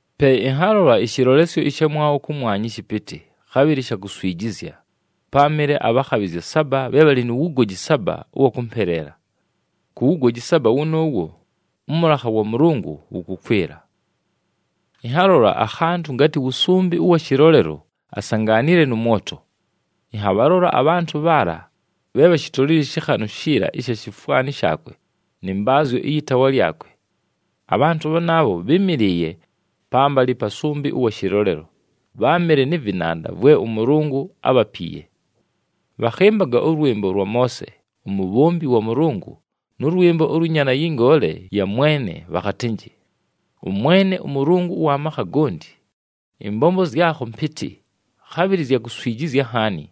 Pe ɨnhalola ɨshɨlolesyo ɨshamwabho kʉmwanya ɨshɨpɨtɨ, khabhɨlɨ sha kuswijizya: páamɨle abhakhabhɨzya saba bhe bhalɨ nu wugoji saba ʉwa kʉmpeleela. Ku wugoji saba wʉnʉʉwo, ʉmʉlakha wa Mʉlʉngʉ wʉkʉkwɨla. Ɨnhalola akhantʉ ngatɨ wʉsʉmbɨ ʉwa shɨlolelo, asangaanile nʉ mwoto. Ɨnhabhalola abhantʉ bhaala bhe bhashitolile ɨshɨkhanʉ shiila ni shifwani shaakwe nɨ mbaazyo ɨyɨ taawa lyakwe. Abhantʉ bhanaabho bhɨ́mɨlɨɨye pambalɨ pa sʉmbɨ ʉwa shɨlolelo, bháamɨle nɨ vɨnanda vwe ʉMʉlʉngʉ ábhapiiye. Bhakhɨmbaga ʉlwɨmbo lwa Moose, umubhombi wa Mʉlʉngʉ nʉ lwɨmbo ʉlwɨ Nyaana yɨ Ngoole ya Mwene, bhakhatɨnjɨ, “ɄMwene ʉMʉlʉngʉ ʉwa makha gonti, ɨmbombo zyakho mpɨtɨ, khabhɨlɨ zya kuswijizya nhaani!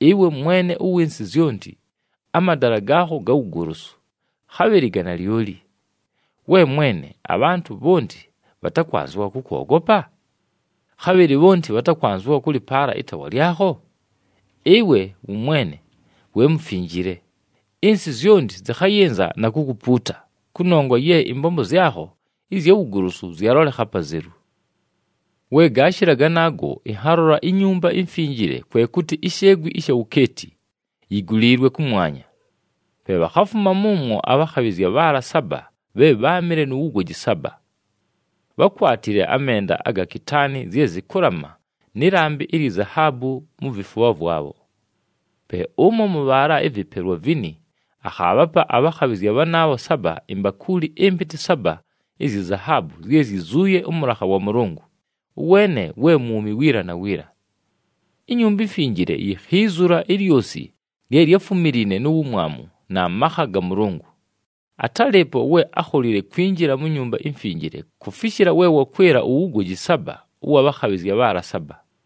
Ɨwe Mwene ʉwɨ nsɨ yonti, amadala gaakho ga wugolosu, khabhɨlɨ ga nalyoli! We Mwene, abhantʉ bhonti bhatakwanzɨwa kʉkwogopa? Khabhɨlɨ bhonti bhatakwanzɨwa kʉlɨpaala ɨtaawa lyakho? Ɨwe wʉmwene we Mufinjile! Ɨnsɨ zyonti zɨkhayɨnza na kukupuuta kʉnongwa ye ɨmbombo zyakho ɨzya wugolosu zyalolekha apazelu.” We gaashɨla ganaago, ɨnhalola iNyumba iMfinjile, kwe kʉtɨ isheegwi ɨsha wukeeti, yiguliilwe kʉmwanya. Pe bhakhafuma mʉmwo abhakhabhɨzya bhaala saba bhe bháamɨle nu wugoji saba. Bhákwatile amenda aga kitaani zye zɨkʉlama nɨ lambɨ ilyi zahaabu mu vifubha vwabho. Pe ʉmo mʉ bhaala ɨvɨpelwa vini akhaabhapa abhakhabhɨzya bhanaabho saba imbakuuli ɨmpɨtɨ saba izyi zahaabu zye zyizuuye ʉmʉlakha wa Mʉlʉngʉ, ʉweene we mwumi wiila na wiila. INyumba iMfinjile yikhiizula ilyosi lye lyáfumiliine nu wumwamu na makha ga Mʉlʉngʉ. Atálɨɨpo we ákholile kwinjila mu Nyumba iMfinjile kufishila we wakwɨla uwugoji saba ʉwa bhakhabhɨzya bhaala saba.